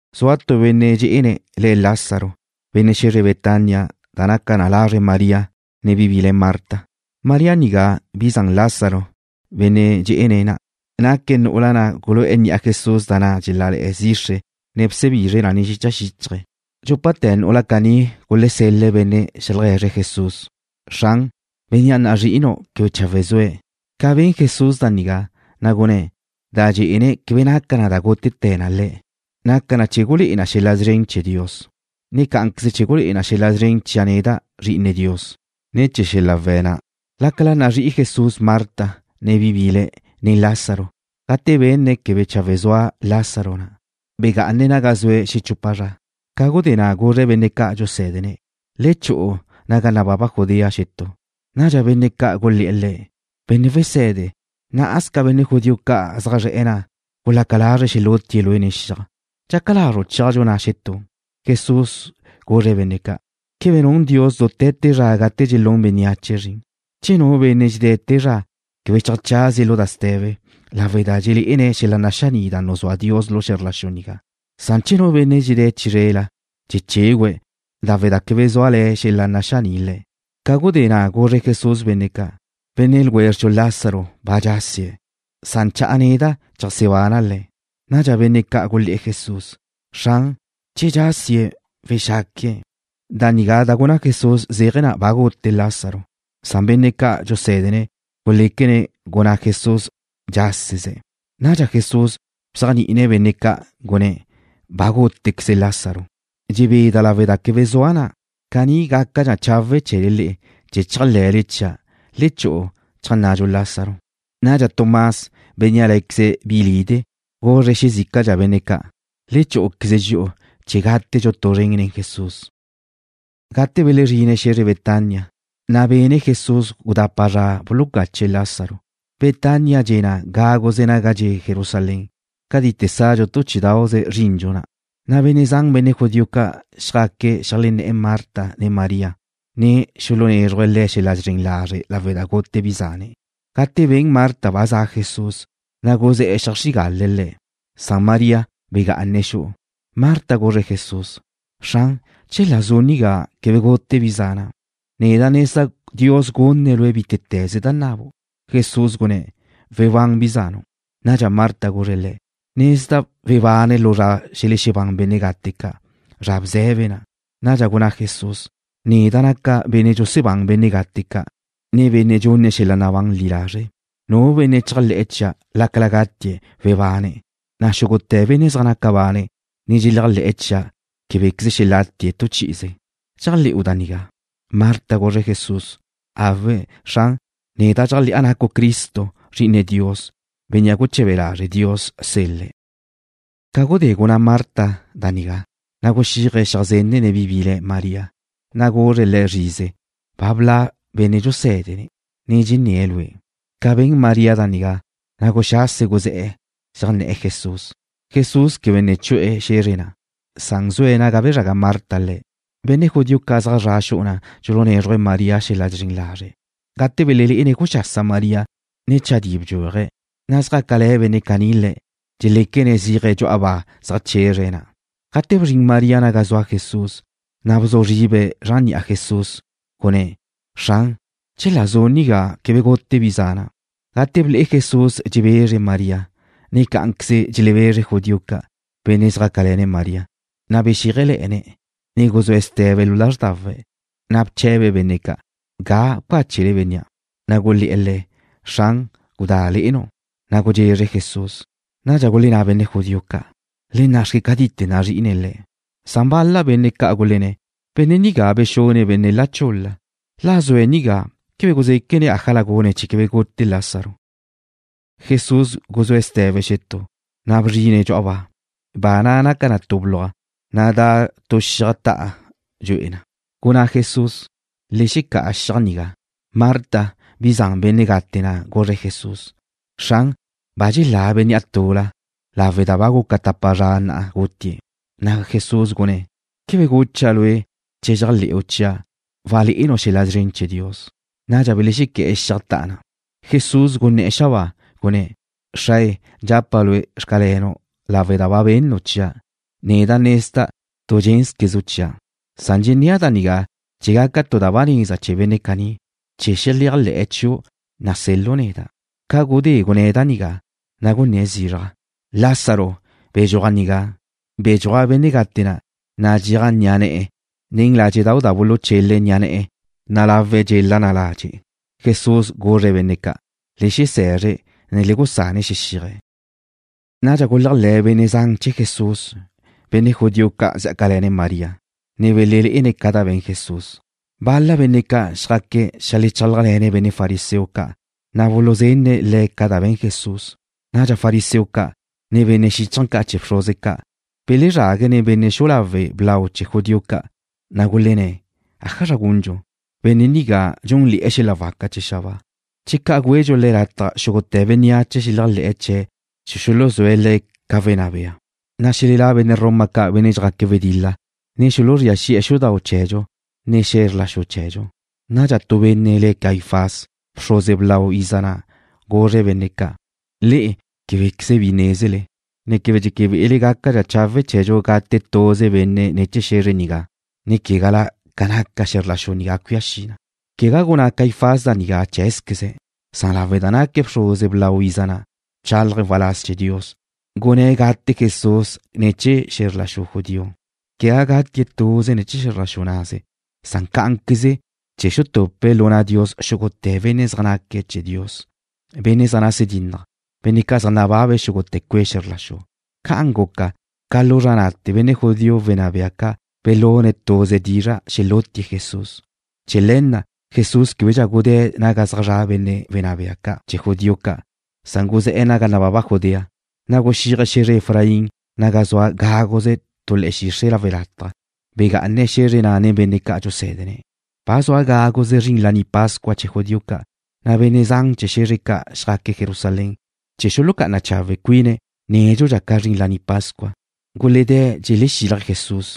Zua tu benne' dxé'ene̱' le̱' Lázaro, benne' xe̱zre Betania, da naca na lazre María, ne bi bile̱' le̱' Marta. María nigá, bi zan Lázaro, benne' dxé'ene̱' na', naque̱' nu'ula na' gulu'e̱ ni'a Jesús da na' dxelále̱'e̱ zixre, ne bsebizre̱' na nen xicha xíchaje̱'. Dxúpate̱ nu'ula caní gulesel-le̱' benne' xeaje̱zre̱' Jesús: ―Xran, bénnea' nazrí'inu' quebe chawe' zue̱'. Ca ben Jesús da nigá, na' gunné̱': ―Da dxé'ene̱' quebe naca na da gútete̱ na le̱'. Naca na chee̱ gulé'e lau na xel-la' szren chee̱ Dios, ne cá'anqueze chee̱ gulé'e lau na xel-la' szren chia' neda', Zri'ine Dios, ne̱ chee̱ xel-la' we̱' na'. Lácala nazrí'i Jesús Marta, ne bi bile̱', ne Lázaro, gate benne̱' quebe chawe' zua Lázaro na', begá'ane̱' naga zue̱' xechupa zra. Ca gudé na' guzre̱' benne' ca' dxusé̱dene̱': ―Le chu'u naga nababa Judea xetú. Nadxa benne' ca' gulé̱'e̱ Le̱': ―Benne' Wese̱de, ná'asca benne' judío ca' zaj zre̱'e̱ na' gulaca lazre̱' xelútie̱' Lue' nen xiaj. ¿Dxaca lazru' chéaju' na' xetú? Jesús guzre̱' benne' ca': ―¿Quebe nun Dios dute̱ te zra gate dxelún bénneache zrin? Che nu benne' dxedé̱' te zra, quebe cheajchazie̱' lu da ste̱be lawe' da dxelé'ene̱' xel-la' naxaní' da nuzúa Dios lu xe̱zr la xu nigá. Che nu benne' dxedé̱' chizrela, dxechégüe̱' lawe' da quebe zúale̱ xel-la' naxaní' le̱'. Ca gudé na' guzre Jesús benne' ca': ―Benne' ljwézredxu Lázaro ba dxásie̱'. Cha'a neda' cheajsebana' le̱'. Nadxa benne' ca' gulé̱'e̱ Jesús: ―Xran, che dxásie̱', wexaque̱'. Da nigá da gunná Jesús zéaje̱ na ba gute Lázaro. Benne' ca' dxusé̱dene̱' guléquene̱' gunná Jesús dxáseze̱'. Nadxa Jesús bzéajni'ine̱' benne' ca', gunné̱': ―Ba gútequeze Lázaro. Dxebeda' lawe' da quebe zua' na'. Caní gácadxa chawe' chee̱le le'e, chee̱ chéajle̱le chia'. Le chu'u cheajnnadxu Lázaro. Nadxa Tomás, bénnea' lé̱queze̱' bilide', guzre̱' xezícala benne' ca': ―Le chú'uqueze dxi'u chee̱ gátedxu tu zren nen Jesús. Gate belezrine̱' xe̱zre Betania, na' bene Jesús gudapa zra bulucache̱' Lázaro. Betania dxe' na gáguze naga dxe' Jerusalén, ca cadite sadxu tu chí'idau'ze zrindxu na', na' benne' zan benne' judío ca' xjaque̱' xeajlenné̱'e̱ Marta ne María, na' xulunézruje̱' le̱' xel-la' zren lazre' lawe' da gute bi zane̱'. Gate ben Marta ba za' Jesús, na' guzé̱'e̱ zeajxrígale̱' Le̱', na' María begá'ane̱' xu'u. Marta guzre̱' Jesús: ―Xran, chela zu' nigá, quebe gute bi zana'. Neda' nezda' Dios gunne̱' Lue' bítete̱ze da nabu'. Jesús gunné̱': ―Webán bi zanu'. Nadxa Marta guzre̱' Le̱': ―Nezda' webane̱' lu zra xelexebán benne' gate ca', zra bze̱be na'. Nadxa gunná Jesús: ―Neda' naca' benne' dxusebáne̱' benne' gate ca', ne benne' dxunne̱' xel-la' nabán li lazre'. Nu benne' dxéajle̱'e̱ chia', lácala gatie̱', webane̱', na' xúgute̱ benne' zaj naca bane̱', ne dxeléajle̱'e̱ chia', québequeze xelatie̱' tu chi'ize. ¿Dxéajle̱'u da nigá? Marta guzre̱' Jesús: ―Awe', Xran. Neda' dxéajle̱'a nacu' Cristo, Zri'ine Dios, Bénnea' guche̱be lazre' Dios sel-le̱'. Ca gudé gunná Marta da nigá, na' guxíaje̱' xeajzenne̱' bi bile̱' María, na' guzre̱' le̱' zrize: ―Ba bla' Benne' dxuse̱de, ne dxenné̱' lue'. Ca ben María da nigá, na' guxase̱' guzé̱'e̱, xeajnné̱'e̱ Jesús. Jesús quebe ne chu'e̱ xe̱zre na', na' zue̱' naga bezraga Marta Le̱'. Benne' judío ca' zaj zra' xu'u na' dxulunézruje̱' María xel-la' zren lazre', gate belelé'ene̱' guxasa María, ne chadí bdxúaje̱', na' xjácale̱ benne' caní le̱', dxeléquene̱' zéaje̱' dxu'a ba zeajchezre̱' na'. Gate bzrin María naga zua Jesús, na' bzu zribe̱' zran ni'a Jesús, gunné̱': ―Xran, chela zu' nigá, quebe gute bi zana'. Gate ble'e Jesús dxebezre María, ne cá'anqueze dxelebezre judío ca', benne' zjácale̱ne̱' María, na' bexíajele̱'e̱ne̱', ne guzúe̱' ste̱be lu lázrdawe̱'. Na' bche̱be̱' benne' ca': ―¿Ga bcáchele bénnea'? Na' gulé̱'e̱ Le̱': ―Xran, gudá le'enu'. Na' gudxezre Jesús. Nadxa gulenná benne' judío ca': ―Le nna'xque cátite̱ nazrí'ine̱' le̱'. Bal-la benne' ca' gulenné̱': ―Benne' nigá bexune̱' benne' la chul-la. La zue̱' nigá, ¿quebe guzéquene̱' ájala gune̱' chee̱ quebe gute Lázaro? Jesús guzúe̱' ste̱be xetú, na' bzrine̱' dxu'a ba. Ba na' naca na tu bluaj, na' da' tu xiaj ta'a dxu'e na. Gunná Jesús: ―Le xecá'a xiaj nigá. Marta, bi zan benne' gate na' guzre̱' Jesús: ―Xran, ba dxelá bénnea' tula, lawe' da ba guca tapa zra na'a gutie̱'. Na' Jesús gunné̱': ―¿Quebe gucha' lue' che chéajle̱'u chia', walé'enu' xel-la' szren chee̱ Dios? Nadxa belexequé̱'e̱ xiaj ta'a na'. Jesús guné̱'e̱ xabáa, gunné̱': ―Xrae, dxapa' Lue': “Xcalenu'” lawe' da ba bennu' chia'. Neda' nezda' tu dxénzquezenu' chia'. Dxennéa' da nigá chee̱ gaca tu da ba neza chee̱ benne' caní, chee̱ xeléajle̱'e̱ chiu' nasel-lu' neda'. Ca gudé gunné̱' da nigá, na' gunné̱' zizraj: ―¡Lázaro, bedxúaj nigá! Bedxúaj benne' gate na', nadxéaj ni'a ne̱'e̱ nen ládxe'dau' da buluchele̱' ni'a ne̱'e̱, na' lawe̱' dxela na ladxe'. Jesús guzre̱' benne' ca': ―Le xese̱zre̱', ne le gusane̱' xexíaje̱'. Nadxa guléajle̱ benne' zan chee̱ Jesús, benne' judío ca' xjácale̱ María, ne belelé'ene̱' ca da be̱n Jesús. Bal-la benne' ca' xjaque̱' xeajlechálajle̱ne̱' benne' fariseo ca', na' buluzenne̱' le̱' ca da be̱n Jesús. Nadxa fariseo ca', ne benne' xíchaje̱ ca' chee̱ bxruze ca' belezrague̱' nen benne' xu'u lawe' blau chee̱ judío ca', na' gulenné̱': ―¿Ájazra gundxu? Benne' nigá dxúnle̱'e̱ xel-la' waca da za xabáa. Che ca' güedxu Le̱' lataj, xúgute̱ bénneache xeleajlé̱'e̱ chee̱' chee̱ xuluzúe̱' Le̱' ca wenná bea, na' xelelá' benne' Roma ca', benne' zjaque̱' wedil-la, na' xuluzría xi'e̱ xudau' chee̱dxu, ne xe̱zr la xu chee̱dxu. Nadxa tu benne' le̱' Caifás, bxruze blau iza na', guzre̱' benne' ca': ―Le'e québequeze bi nézele, ne quebe dxeque be'ele gácadxa chawe' chee̱dxu gate' tuze benne' ne̱ chee̱ xe̱zre nigá, ne quegala ca naca xe̱zr la xu nigá cuía xi na. (Quegá gunná Caifás da nigá cheé̱zqueze̱'. Lawe' da naque̱' bxruze blau iza na', bchálaje̱' waláz chee̱ Dios, gunné̱' gate' Jesús ne̱ chee̱ xe̱zr la xu judío. Quegá gatie̱' tuze ne̱ chee̱ xe̱zr la xu naze. Cá'anqueze chee̱ xutupe̱' lu na' Dios xúgute̱ benne' zaj naque̱' chee̱ Dios, benne' zaj nase dínnaje̱', benne' ca' zaj nababe̱' xúgute̱ cue' xe̱zr la xu.) Ca'an guca, ca lu zra na'te̱ benne' judío wenná bea ca' belune̱' tuze dizra' xelútie̱' Jesús. Chee̱ le̱ na' Jesús québedxa gudé̱' naga zaj zra' benne' wenná bea ca' chee̱ judío ca', na' guzé̱'e̱ naga nababa Judea, na' guxíaje̱' xe̱zre Efraín naga zua gáguze tu le̱'e̱ xixre' lawe' lataj. Begá'ane̱' xe̱zre na' nen benne' ca' dxusé̱dene̱'. Ba zua gáguze zrin Laní Pascua chee̱ judío ca', na' benne' zan chee̱ xe̱zre ca' xjaque̱' Jerusalén chee̱ xulucá'ana chawe' cuine̱' nédxudxa ca zrin Laní Pascua. Guledé̱' dxelexílaje̱' Jesús,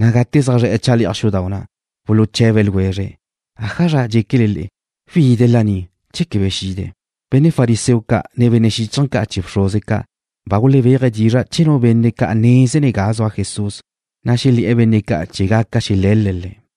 na' gate zaj zre̱'e̱ chale'aj xudau' na', buluche̱be ljwezre̱': ―¿'Ajazra dxéquele? ¿Wide̱' laní, che quebe xide̱'? Benne' fariseo ca', ne benne' xíchaje̱ ca' chee̱ bxruze ca' ba gulebéaje̱' dizra' che nu benne' ca' nézene̱' ga zua Jesús, na' xelé̱'e̱ benne' ca' chee̱ gaca xele̱l-le̱' Le̱'.